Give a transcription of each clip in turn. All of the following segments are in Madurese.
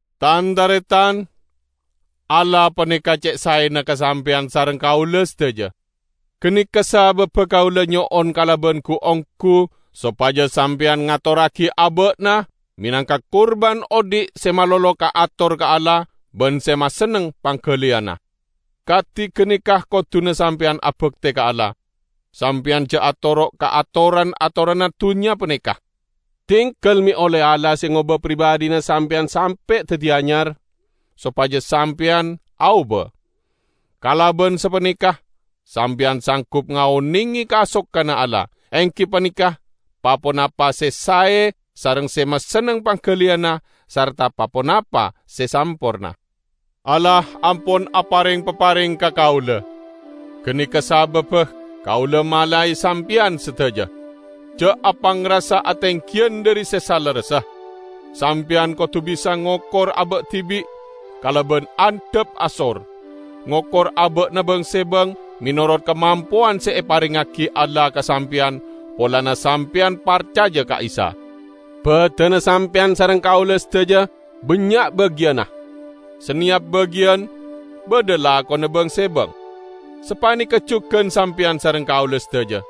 Tan-taretan! Allah paneka ce' saena ka sampeyan sareng kaula sadaja. Ganeka sababba kaula nyo'on kalaban gu-onggu sopaja sampeyan ngatorragi aba'na menangka kurban odhi' se malolo kaator ka Allah ban se masenneng panggaliyanna. Kadi ganeka koduna sampeyan abakte ka Allah. Sampeyan ja' atoro' ka atoran-atoranna dunnya paneka. Dinggal me' olle Allah se ngoba pribadhina sampeyan sampe' daddi anyar, sopaja sampeyan aoba. Kalaban sapaneka sampeyan sanggup ngaonenge kasokanna Allah -- enggi paneka pa-ponapa se sae sareng se masenneng panggaliyanna sarta pa-ponapa se samporna. Allah ampon apareng papareng ka kaula. Ganeka sababba kaula malae sampeyan sadaja: Ja' apangrasa atenggiyan dhari se salerressa. Sampeyan kodu bisa ngokor aba' dibi' kalaban andhap asor; ngokor aba'na bang-sebang menorot kamampowan se eparengngagi Allah ka sampeyan polana sampeyan parcaja ka Isa. Badanna sampeyan sareng kaula sadaja bannya' bagiyanna. Saneyap bagiyan badha lakona bang-sebang. Sapaneka jugan sampeyan sareng kaula sadaja.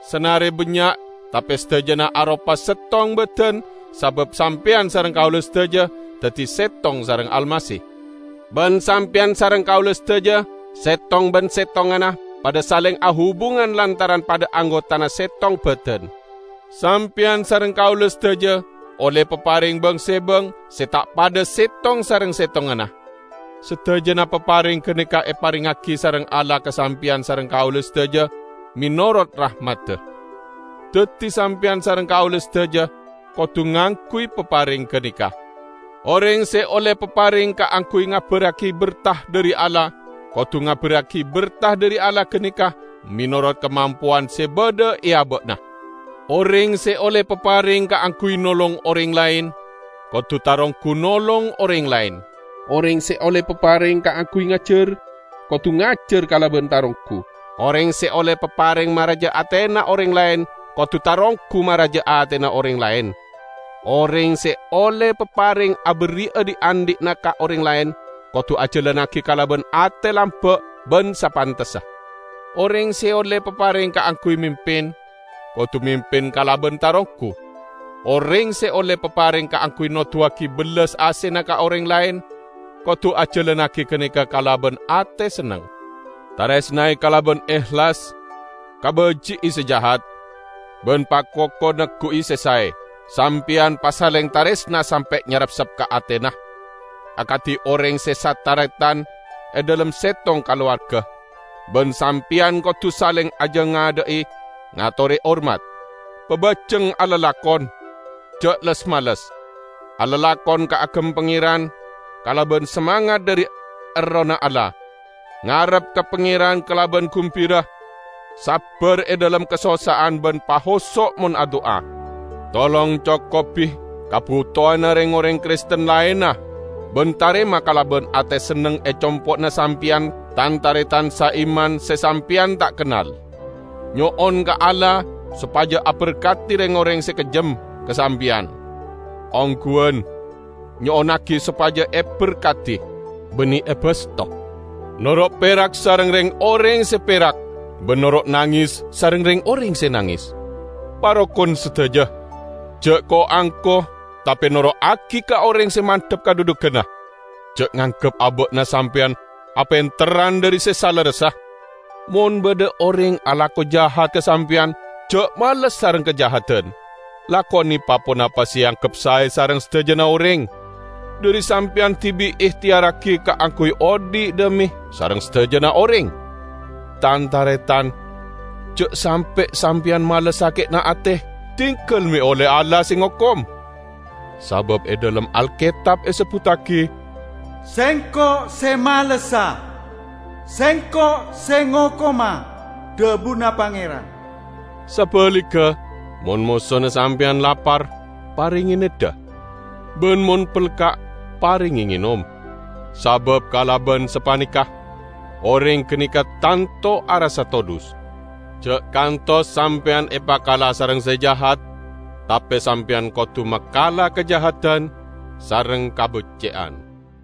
Sanare bannya' tape sadajana aropa settong badan sabab sampeyan sareng kaula sadaja daddi settong sareng Almasih. Ban sampeyan sareng kaula sadaja settong ban settonganna padha saleng ahubungan lantaran padha anggotana settong badan. Sampeyan sareng kaula sadaja olle papareng bang-sebang se ta' padha settong sareng settonganna. Sadajana papareng ganeka eparengngagi sareng Allah ka sampeyan sareng kaula sadaja menorot rahmadda. Daddi sampeyan sareng kaula sadaja kodu ngangguy papareng ganeka. Oreng se olle papareng kaangguy ngabarragi berta dhari Allah, kodu ngabarragi berta dhari Allah ganeka menorot kamampowan se badha e aba'na. Oreng se olle papareng kaangguy nolong oreng laen, kodu taronggu nolong oreng laen. Oreng se olle papareng kaangguy ngajar, kodu ngajar kalaban taronggu. Oreng se olle papareng maraja atena oreng laen, kodu taronggu maraja atena oreng laen. Oreng se olle papareng aberri'a dhi'-andhi'na ka oreng laen, kodu ajalannagi kalaban ate lamba' ban sapantessa. Oreng se olle papareng kaangguy mimpin, kodu mimpin kalaban taronggu. Oreng se olle papareng kaangguy noduwagi bellas asena ka oreng laen, kodu ajalannagi ganeka kalaban ate senneng. Taresnae kalaban ehlas. Kabaji'i se jahat, ban pakoko neggu'i se sae. Sampeyan pasaleng taresna sampe' nyarepsep ka atena, akadi oreng se sataretan e dhalem settong kalowarga, ban sampeyan kodu saleng ajangadha'i ngatore hormat. Pabajeng alalakon. Ja' les-males. Alalakon kaagem Pangeran kalaban samangat dhari Errohna Allah. Ngarep ka Pangeran kalaban gumbira, sabbar e dhalem kasossa'an ban pahoso' mon adu'a. Tolong cokobi kabutowanna reng-oreng Kristen laenna ban tarema kalaban ate senneng e compo'na sampeyan tan-taretan saiman se sampeyan ta' kennal. Nyo'on ka Allah sopaja aberkadi reng-oreng se kejjem ka sampeyan; ongguwan, nyo'onnagi sopaja eberkadi, banne ebasto. Noro' perak sareng reng-oreng se perak, ban noro' nanges sareng reng-oreng se nanges. Parokon sadaja. Ja' ko-angko, tape noro'agi ka oreng se mandhap kadhudhuganna. Ja' nganggep aba'na sampeyan apenterran dhari se salerressa. Mon badha oreng alako jahat ka sampeyan, ja' males sareng kajahadan. Lakone pa-ponapa se eanggep sae sareng sadajana oreng. Dhari sampeyan dibi' ehteyarragi kaangguy odhi' dhame sareng sadajana oreng. Tan-taretan! Ja' sampe' sampeyan males sake'na ate, diggal me' olle Allah se ngokom. Sabab e dhalem Alketab esebbuttagi, "Sengko' se malessa. Sengko' se ngokoma, dhabuna Pangeran." Sabaligga, mon mosona sampeyan lapar, parenge neddha; ban mon pelka', parenge ngenom. Sabab kalaban sapaneka, oreng ganeka tanto arassa todhus. Ja' kantos sampeyan epakala sareng se jahat, tape sampeyan kodu makala kajahadan sareng kabecce'an.